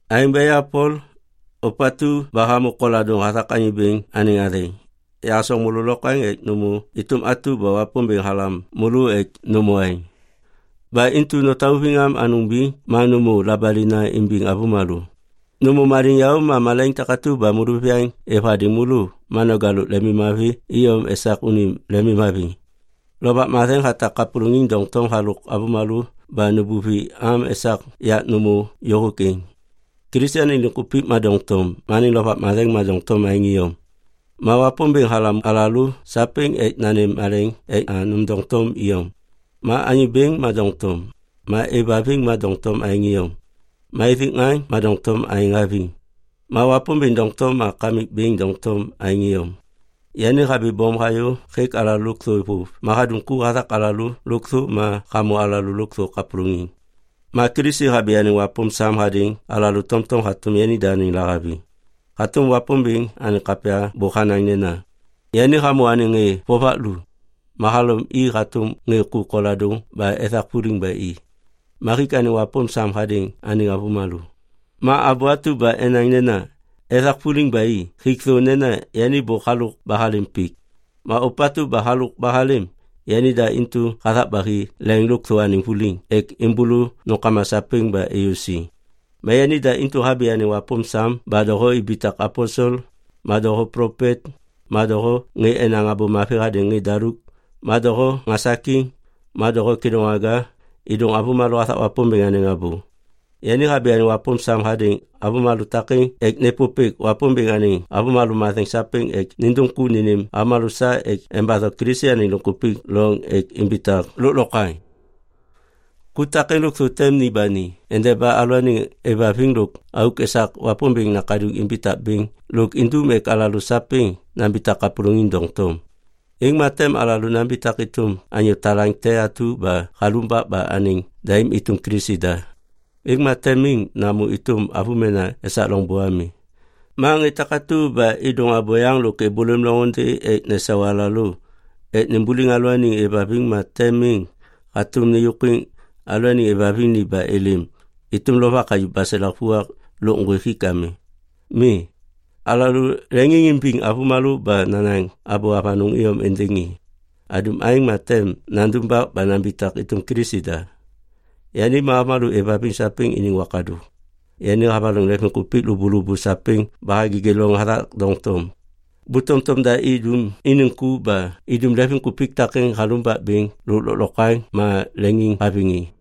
Aêŋ ba ya Pol, ôpatu ba hamô koladôŋ hathak Anyô Bêŋ anêŋ athêŋ, yahasoŋ môlô lokwaŋ ek nômô êtôm atu ba Wapômbêŋ halam môlô ek nômô aêŋ. Ba intu notauviŋ am anôŋ biŋ ma nômô labalina imbiŋ avômalô. Nômô maliŋyaô ma malaiŋ takatu ba môlôviyaŋ êv hadêŋ môlô ma noja lôk lemimmavi iyom esak unim lemimhaviŋ. Lovak Matheŋ hatak kapôlôŋiŋ doŋtom halôk alalô ba nubuvi am esak yak nômô yôhôk êŋ. Kilisi anêŋ liŋkupik ma doŋtom, ma Lovak Matheŋ ma doŋtom aêŋ iyom. Ma Wapômbêŋ halam alalô sapêŋ ek nanêm maleŋ ek nôm doŋtom iyom. Ma Anyô Bêŋ ma doŋtom, ma êvhaviŋ ma doŋtom aêŋ iyom, ma ithik ŋaŋ ma doŋtom aêŋ haviŋ. Ma Wapômbêŋ doŋtom ma Kamikbêŋ doŋtom aêŋ iyom. Yani habibôm hayô hêk alalô lôkthô vôv ma hadum ku hathak alalô lôkthô ma hamô alalô lôkthô kapôlôŋiŋ. Ma Kilisi habi anêŋ wapôm sam hadêŋ alalô tomtom hatôm yanida anêŋ lahaviŋ. Hatôm Wapômbêŋ anêŋ kapya bôk hanaŋ nena, “Yani hamô anêŋ ŋê vovak lu, ma halom i hatôm ŋê ku koladôŋ ba ethak vuliŋ ba i, ma hik anêŋ wapôm sam hadêŋ anêŋ avômalô.” Ma abô atu ba enaŋ nena, “ethak vuliŋ ba i” hik thô nena yani bôk halôk ba halêm pik. Ma ôpatu ba halôk ba halêm, yanida intu hathak ba hi leŋ lôkthô anêŋ vuliŋ ek êmbôlô nômkama sapêŋ ba êyô siŋ. Ma yanida intu habi anêŋ wapôm sam ba doho ibitak aposel, ma doho plopet, ma doho ŋê enaŋ Abô Mavi hadêŋ ŋê daluk, ma doho ŋasakiŋ, ma doho kêdôŋwaga êdôŋ avômalô hathak Wapômbêŋ anêŋ abô. Yani habi anêŋ wapôm sam hadêŋ avômalô takêŋ ek nêpôpêk Wapômbêŋ anêŋ avômalô matheŋ sapêŋ ek nindum ku nênêm avômalô sa ek embatho Kilisi anêŋ liŋkupik loŋ ek imbitak lôklokwaŋ. Ku takêŋ lôkthô tem ni ba ni endeba alalôaniŋ aêvhaviŋ lôk auk esak Wapômbêŋ Nakaduŋ imbitak bêŋ lôk indum ek alalô sapêŋ nambitak kapôlôŋiŋ doŋtom. Êŋ ma tem alalô nambitak êtôm anyô talaŋ te atu ba halumbak ba anêŋ daim êtôm Kilisi da. Êŋ ma tem miŋ namô êtôm avômena esak loŋbô ami. Ma ŋê takatu ba êdôŋ abôyaŋ lôk êbôlêm loŋôndê ek nesau alalô ek nimbuliŋ alalôaniŋ aêvhaviŋ ma tem miŋ hatôm nêyôkwiŋ alalôaniŋ aêvhaviŋ ni ba êlêm êtôm lovak hayuv baselak vuak lôk ŋgwêk hik ami. Mi, alalô leŋiŋimbiŋ avômalô ba nanaŋ abô avanôŋ iyom êndêŋ i. Adum aêŋ ma tem nandumbak ba nambitak êtôm Kilisi da. Yani ma avômalô êvhaviŋ sapêŋ iniŋ wakadôk. Yani havaloŋ leŋviŋkupik lôbôlôbô sapêŋ ba hagêgê loŋ hathak doŋtom. Bu tomtom da idum iniŋ ku ba idum leŋviŋkupik takêŋ halumbak bêŋ lôk lôklokwaŋ ma leŋiŋhaviŋ i.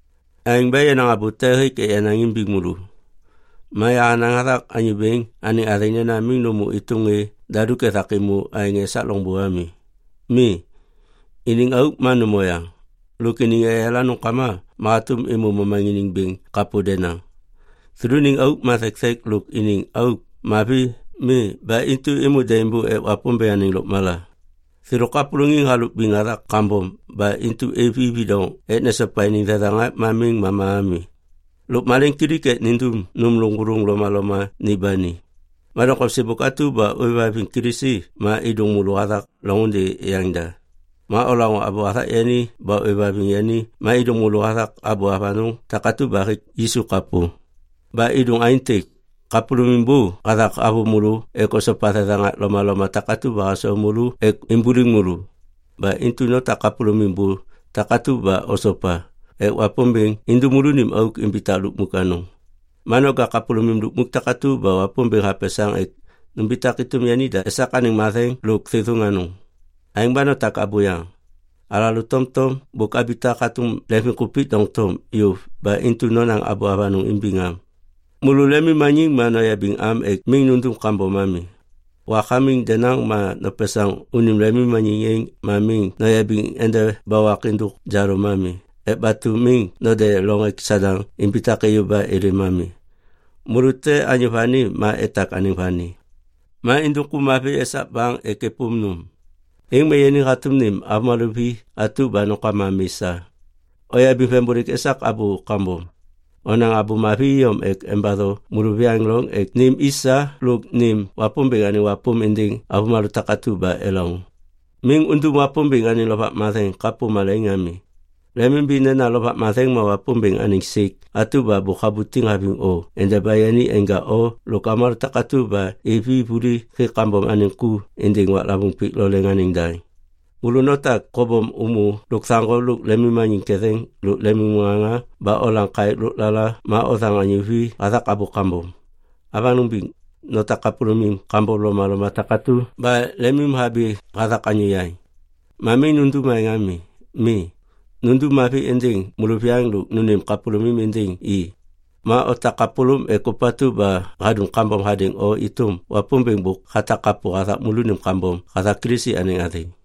Aêŋ ba yenaŋ abô te hêk ek yanaŋ imbiŋ môlô. Ma yahanaŋ hathak Anyô Bêŋ anêŋ athêŋ nena miŋ nômô êtôm ŋê daluk ethak êmô aêŋ esak loŋbô ami. Mi, iniŋ auk ma nôm oyaŋ. Lôk iniŋ eyala nômkama ma hatôm êmô momaŋiniŋ bêŋ kapô denaŋ. Thêlôniŋ auk ma thekthek lôk iniŋ auk mavi mi ba intu êmô daimbô ek Wapômbêŋ anêŋ lôkmala. Thêlô kapôlôŋiŋ halôk biŋ hathak kambom ba intu êv i vidoŋ ek nesopa iniŋ thethaŋak ma miŋ mama ami. Lôk maleŋiŋkilik ek nindum nôm lôŋgôlôŋ lomaloma ni ba ni. Ma doŋtom sêbôk atu ba ôêvhaviŋ Kilisi ma êdôŋ môlô hathak loŋôndê yaŋda. Ma olaŋô abô hathak yani ba ôêvhaviŋ yani ma êdôŋ môlô hathak abô avanôŋ takatu ba hêk Yisu kapô. Ba êdôŋ aêntêk. Kapôlômim bô hathak havôv môlô ek osopa thethaŋak lomaloma takatu ba hasau môlô ek imbuliŋ môlô. Ba intu notak kapôlômim bô takatu ba osopa ek Wapômbêŋ indum môlônim auk imbitak lukmuk anôŋ. Ma noja kapôlômim lukmuk takatu ba Wapômbêŋ hapesaŋ ek numbitak êtôm yanida esak anêŋ matheŋ lôk thêthôŋ anôŋ. Aêŋ ba notak abôyaŋ. Alalô tomtom bôk abitak hatôm leŋviŋkupik doŋtom yôv ba intu nonaŋ abô avanôŋ imbiŋam. Môlô lemimmaniŋ ma noyabiŋ am ek miŋ nundum kambom ami. Wak hamiŋ denaŋ ma nopesaŋ unim lemmaniŋ êŋ ma miŋ noyabiŋ endeba wak êndôk jalôm ami ek batu miŋ node loŋ ek Sadaŋ imbitak êyô ba êlêm ami. Môlô te anyô vani ma etak anêŋ vani. Ma indum ku mavi esak baŋ ek êpôm nôm. Êŋ ma yani hatôm nêm avômalô vi atu ba nômkama mi sa. Oyabiŋ vembôlêk esak abô kambom. Onaŋ abô mavi iyom ek embatho môlôviyaŋ loŋ ek nêm i sa lôk nêm Wapômbêŋ anêŋ wapôm êndêŋ avômalô takatu ba elaŋô. Miŋ undum Wapômbêŋ anêŋ Lovak Matheŋ kapô malaiŋ ami. Lemimimbi nena Lovak Matheŋ ma Wapômbêŋ anêŋ sêk atu ba bôk habutiŋ haviŋ o endeba yani enja o lôk avômalô takatu ba hêv i vuli hêk kambom anêŋ ku êndêŋ waklavôŋ pik lo leŋ anêŋ daŋ. Môlô notak kobom ômô lôkthaŋgo lôk lemimmaniŋ ketheŋ lôk lemimŋaŋa ba olam kaêk lôklala ma othaŋ anyô vi hathak abô kambom. Avanôŋ biŋ, notak kapôlômim kambom lomaloma takatu ba lemimhabi hathak anyô yaŋ. Ma miŋ nundum aêŋ ami. Mi, nundum mavi êndêŋ môlôviyaŋ lôk nônêm kapôlômim êndêŋ i. Ma otak kapôlôm ek ôpatu ba hadum kambom hadêŋ o êtôm Wapômbêŋ bôk hatak kapô hathak môlônim kambom hathak Kilisi anêŋ athêŋ.